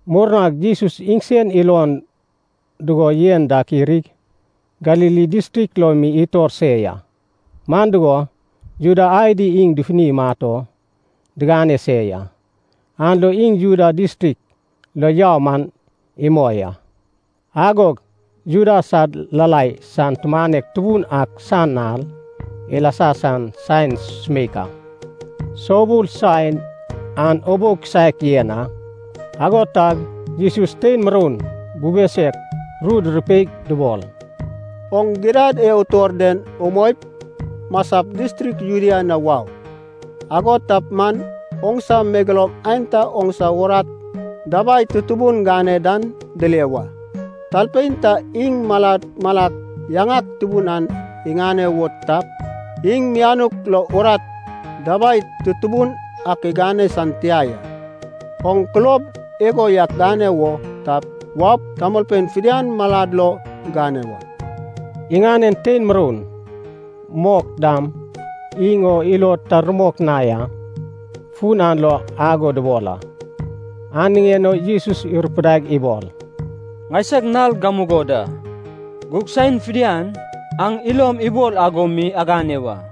Murnag Jesus iŋsen ilon dugo yen dak irig, Galili distrik lo mi itor se ya. Man dugo, Juda adi iŋ dufuni imat o digane se ya, an lo iŋ Judea distrik lo yau man imoi a. Agog Juda sad Lalai san tumanek tubun ak san nal ilasa san saen sumeik a. (Soubul saen an ubou kisaek yen a.) Ago tag Jesus tein muroun bube suek ru durupeig dubol, “Oŋ gidad e utor den umoip, masap distrik Judea na wau. Ago tap man oŋsa megeloum aenta oŋsa urat dabai tutubun gane dan dile wa. Talpein ta iŋ malak malak yaŋak tubun ak iŋane wo tap, iŋ mianuk lo urat dabai tutubun ak igane san tia ya. Oŋ kulob igo yak gane wo tap, waup, tamolpein fidian malad lo gane wa.” Iŋanen tein muroun mok dam iŋ o ilod ta rumok na ya, fun an lo ago dubol a. An niŋen o Jesus irupudaig ibol, “Ŋaisag nal gamugo da, gug saen fidian aŋ ilom ibol ago mi agane wa.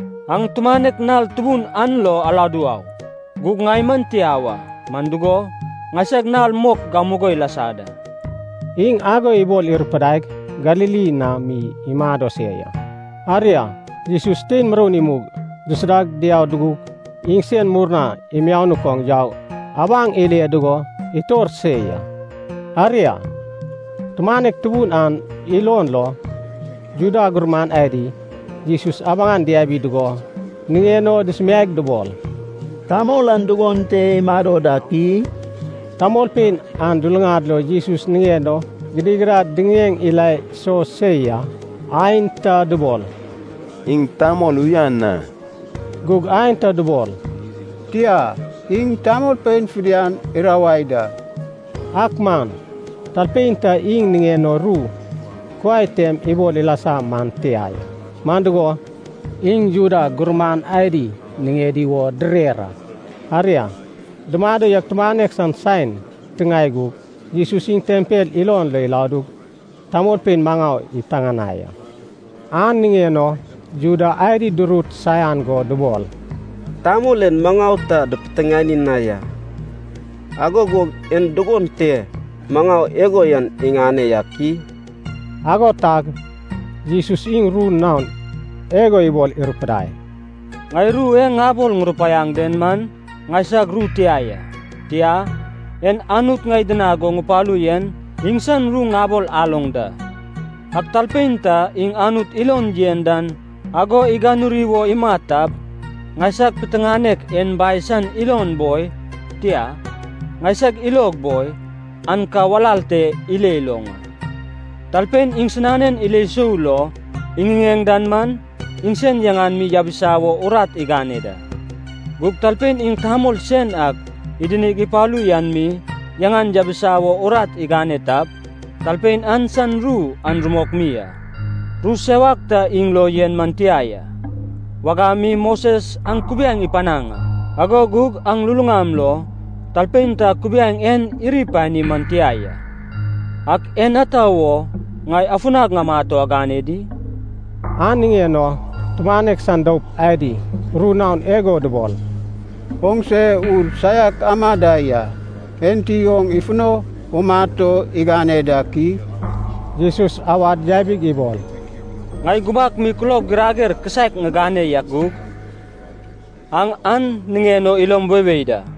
Aŋ tumanek nal tubun an lo aladu au, gug ŋai man tia wa. Man dugo, ŋaisag nal mok gamugo ilasa da.” Iŋ ago ibol irupudaig Galili na mi imado se ya. Aria, Jesus tein muroun imug dusuda diau dugug, iŋsen murna imianuk oŋ yaug abaŋ ile dugo itor se ya. Aria, tumanek tubun an ilon lo, Juda gurman adi Jesus abaŋan diabi dugo, niŋen o dusumiaig dubol, “Tamol an dugon te imado dak i?” Tamolpein an luluŋad lo Jesus niŋen o gidigidad diŋiŋeŋ ila iso se ya. Aenta dubol, “Iŋ tamol uyan a.” Gug aenta dubol, “Tia, iŋ tamolpein fidian irawai da.” Ak man talpein ta iŋ niŋen o ru kuai tem ibol ilasa man tia ya. Man dugo, iŋ Juda gurman adi niŋedi wo direr a. Aria, dumado yaug tumanek san saen titiŋae gug, Jesus iŋ tempel ilon lo iladug tamolpein maŋau ipiteŋanai a. An niŋen o Juda adi durut saian go dubol, “Tamol en maŋau ta dipiteŋani na ya. Ago gug en dugon te maŋau igo yan iŋane yak i?” Ago tag Jesus iŋ ru naon igo ibol irupudai, “Ŋai ru e ŋabol ŋurupaiaŋ den man ŋaisag ru tia ya. Tia, en Anut ŋai idinag go ŋupalu yen iŋsan ru ŋabol aloŋ da. Ak talpein ta iŋ Anut ilon yen dan ago iganuri wo imat tap, ŋaisag piteŋanek en Bai san ilon boi, tia, ŋaisag ilog boi, an ka walal te ile iloŋ a. Talpein iŋsinanen ilo sou lo iŋiŋeŋ dan man, iŋsen yaŋan mi yabisa wo urat igane da. Gug talpein iŋ tamol sen ak idinig ipalu yan mi yaŋan yabisa wo urat igane tap, talpein an san ru an rumok mi a. Ru sewak ta iŋ lo yen man tia ya. Wagam mi Moses aŋ kubiaeŋ ipanaŋ a. Ago gug aŋ luluŋam lo talpein ta kubiaeŋ en iri ipani man tia ya. Ak en ata wo ŋai afunag ŋamat o agane di?” An niŋen o tumanek san doup adi ru naon igo dubol, “Oŋse ur saiak ama da ya. Enti oŋ ifuno umat o igane dak i?” Jesus awad yabig ibol, “Ŋai gubak mi kulob girager kisaek ŋigane yak gug, aŋ an niŋen o ilom weiwei da.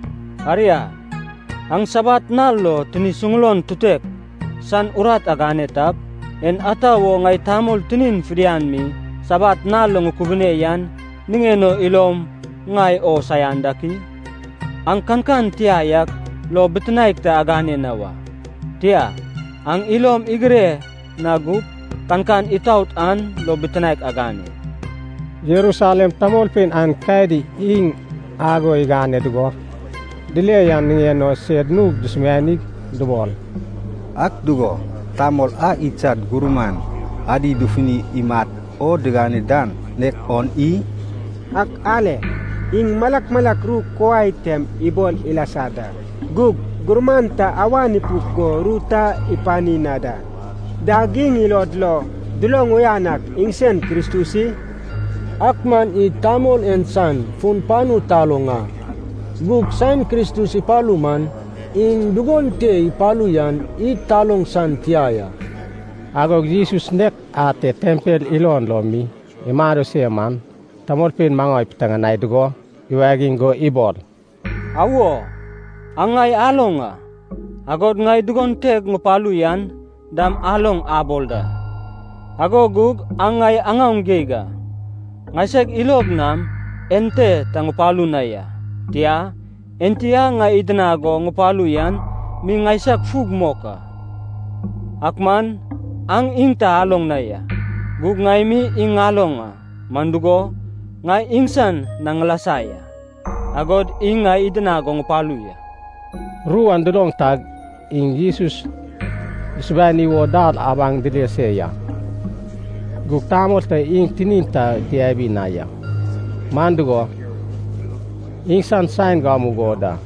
Aria, aŋ sabat nal lo tini suŋulon tutek san urat agane tap, en ata wo ŋai tamol tinin fidian mi sabat nal lo ŋukubune yan niŋen o ilom ŋai o saian dak i? Aŋ kankan tia yak lo bitinaek ta agane na wa, tia, aŋ ilom igire na gup, kankan itaot an lo bitinaek agane.” Jerusalem tamolpein aenkadi iŋ ago igane dugo dile yan niŋen o sed nug dusumianig dubol, “Ak dugo, tamol a idsad gurman adi dufuni imat o digane dan nek on i? Ak ale, iŋ malak malak ru kuai tem ibol ilasa da. Gug gurman ta awan ipuk go ru ta ipani na da. Dag iŋ ilod lo duloŋ uyan ak iŋsen Kristus i? Ak man id tamol en san fun panu taloŋ a, gug saen Kristus ipalu man, iŋ dugon te ipalu yan id taloŋ san tia ya.” Agog Jesus nek ate tempel ilon lo mi imado se man, tamolpein maŋau ipiteŋanai dugo, iwagiŋ go ibol, “Awo, aŋ ŋai aloŋ a, agod ŋai dugon teg ŋupalu yan dam aloŋ abol da. Ago gug aŋ ŋai aŋaoŋ geig a. Ŋaiseg ilog nam ente ta ŋupalu na ya. Tia, Enti a ŋai idinag go ŋupalu yan mi ŋaisag fug mok a, ak man aŋ iŋ ta aloŋ na ya. Gug ŋai mi iŋ ŋaloŋ a, man dugo, ŋai iŋsan na ŋilasa ya, agod iŋ ŋai idinag go ŋupalu ya.” Ru an duloŋ tag iŋ Jesus dusubani wo dal abaŋ dile se ya. Gug tamol ta iŋ tinin ta diabi na ya, man dugo, iŋsan saen gamugo da.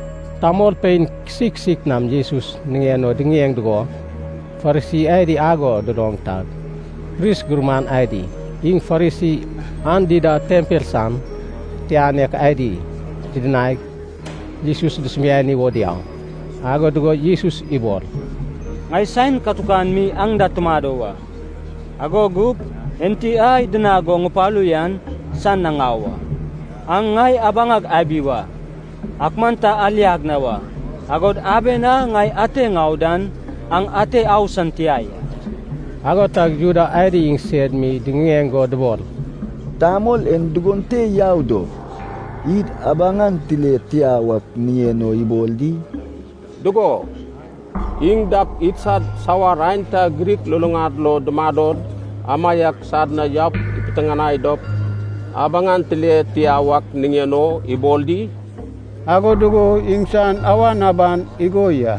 Tamolpein kisik kisik nam Jesus niŋen o diŋiŋeŋ dugo, Farisi adi ago duloŋ tag, pris gurman adi iŋ Farisi an dida tempel san titianek adi didinaig, Jesus dusubani wo diau. Ago dugo Jesus ibol, “Ŋai saen katukan mi aŋ da tumado wa, ago gup Enti a idinag go ŋupalu yan san na ŋau a. Aŋ ŋai abaŋag abi wa, ak man ta aliag na wa. Agod aben a ŋai ate ŋau dan aŋ ate au san tia ya.” Ago tag Juda adi iŋsed mi diŋiŋeŋ go dubol, “Tamol en dugon te yau dop, id abaŋan tile tia wak niŋen o ibol di? Dugo, iŋ dap idsad sawar aenta Grik luluŋad lo dumadod, amaiak sad na yaup ipiteŋanai dop, abaŋan tile tia wak niŋen o ibol di? Ago dugo iŋsan awan aban igo ya,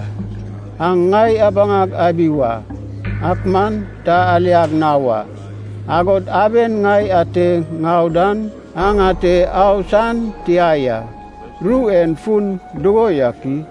‘aŋ ŋai abaŋag abi wa, ak man ta aliag na wa, agod aben ŋai ate ŋau dan aŋ ate au san tia ya.’ Ru en fun dugo yak i?”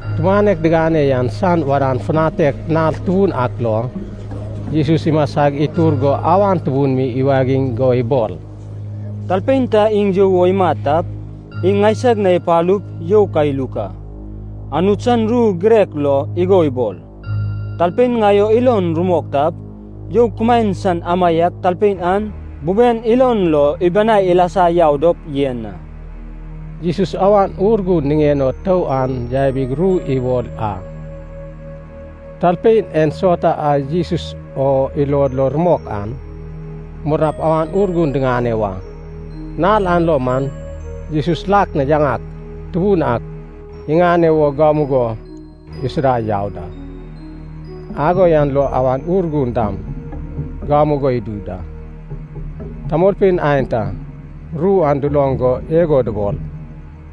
Tumanek digane yan san wadan futanek nal tubun ak lo, Jesus imasa itur go awan tubun mi iwagiŋ go ibol, “Talpein ta iŋ you wo imat tap, iŋ ŋaisag na ipalup you ka iluk a. Anut san ru girek lo igo ibol, talpein ŋai o ilon rumok tap, ‘you kumaen san amaiak talpein an buben ilon lo ibanai ilasa yau dop yen a.’” Jesus Awan Urgun niŋen o tou an yabig ru ibol a. Talpein ensauta a Jesus o ilod lo rumok an murnap Awan Urgun diŋane wa. Nal an lo man Jesus lak na yaŋak tubun ak iŋane wo gamugo isuda yau da, ago yan lo Awan Urgun dam gamugo idu da. Tamolpein aenta ru an duloŋ go igo dubol,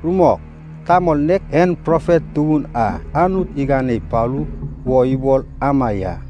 “Rumok, tamol nek en profet tubun a Anut igane ipalu wo ibol ama ya.”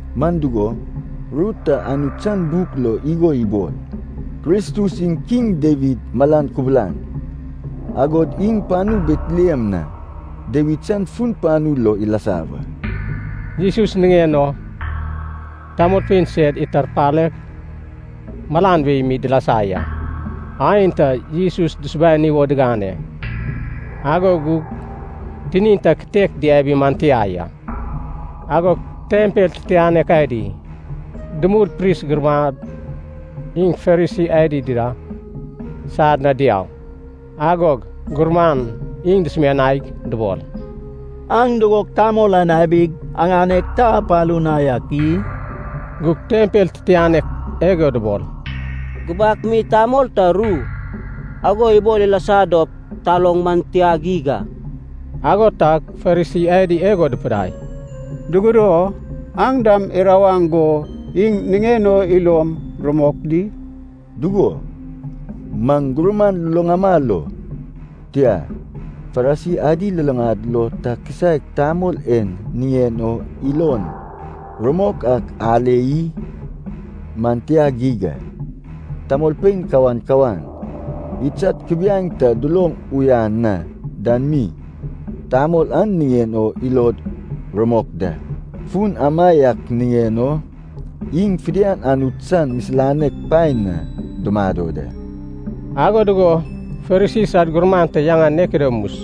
Man dugo, ru ta Anut san buk lo igo ibol, Kristus iŋ Kiŋ Dawid malan kubulan. Agod iŋ panu Betlehem na, Dawid san fun panu lo ilasa wa.” Jesus niŋen o tamolpein sed itarpaleg malan wei mi dilasa ya. Aenta Jesus dusubani wo digane, ago gug tinin ta kitek diabi man tia ya. Agog tempel titianek adi dumul pris gurman iŋ Farisi adi dida sad na diau, agog gurman iŋ dusumianaig dubol. “Aŋ dugog tamol an abig, aŋaneg ta apalu na yak i?” Gug tempel titianek igo dubol, “Gubak mi tamol ta ru ago ibol ilasa dop taloŋ man tia geig a.” Ago tag Farisi adi igo dupidai, “Dugudo? Aŋ dam irawaŋ go iŋ niŋen o ilom rumok di? Dugo, maŋ gurman luluŋama lo, tia, Farisi adi luluŋad lo ta kisaek tamol en niŋen o ilon rumok ak ale i? Man tia geig a. Tamolpein kawan kawan, idsad kubiaeŋ ta duloŋ uyan na den mi, tamol an niŋen o ilod rumok da. Fun amaiak niŋen o iŋ fidian Anut san misilanek paen na dumado da.” Ago dugo Farisi sad gurman ta yaŋan Nikodemus,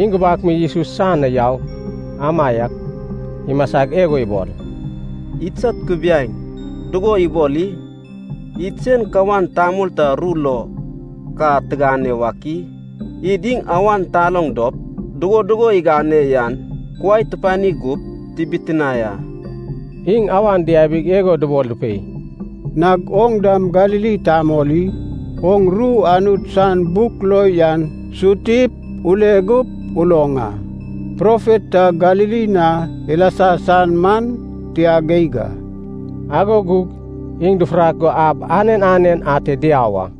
iŋ gubak mi Jesus san na yau amaiak imasag igo ibol, “Idsad kubiaeŋ, dugo ibol i? Id sen kawan tamol ta ru lo ka tigane wak i? Id iŋ awan taloŋ dop, dugo dugo igane yan kuai tupani gup, tibitinae a.” Iŋ awan diabig igo dubol dupei, “Nag oŋ dam Galili tamol i? Oŋ ru Anut san buk lo yan sutip ule gup uloŋ a, profet ta Galili na ilasa san man tia geig a.” Ago gug iŋ dufurak go ab anen anen ate diau a.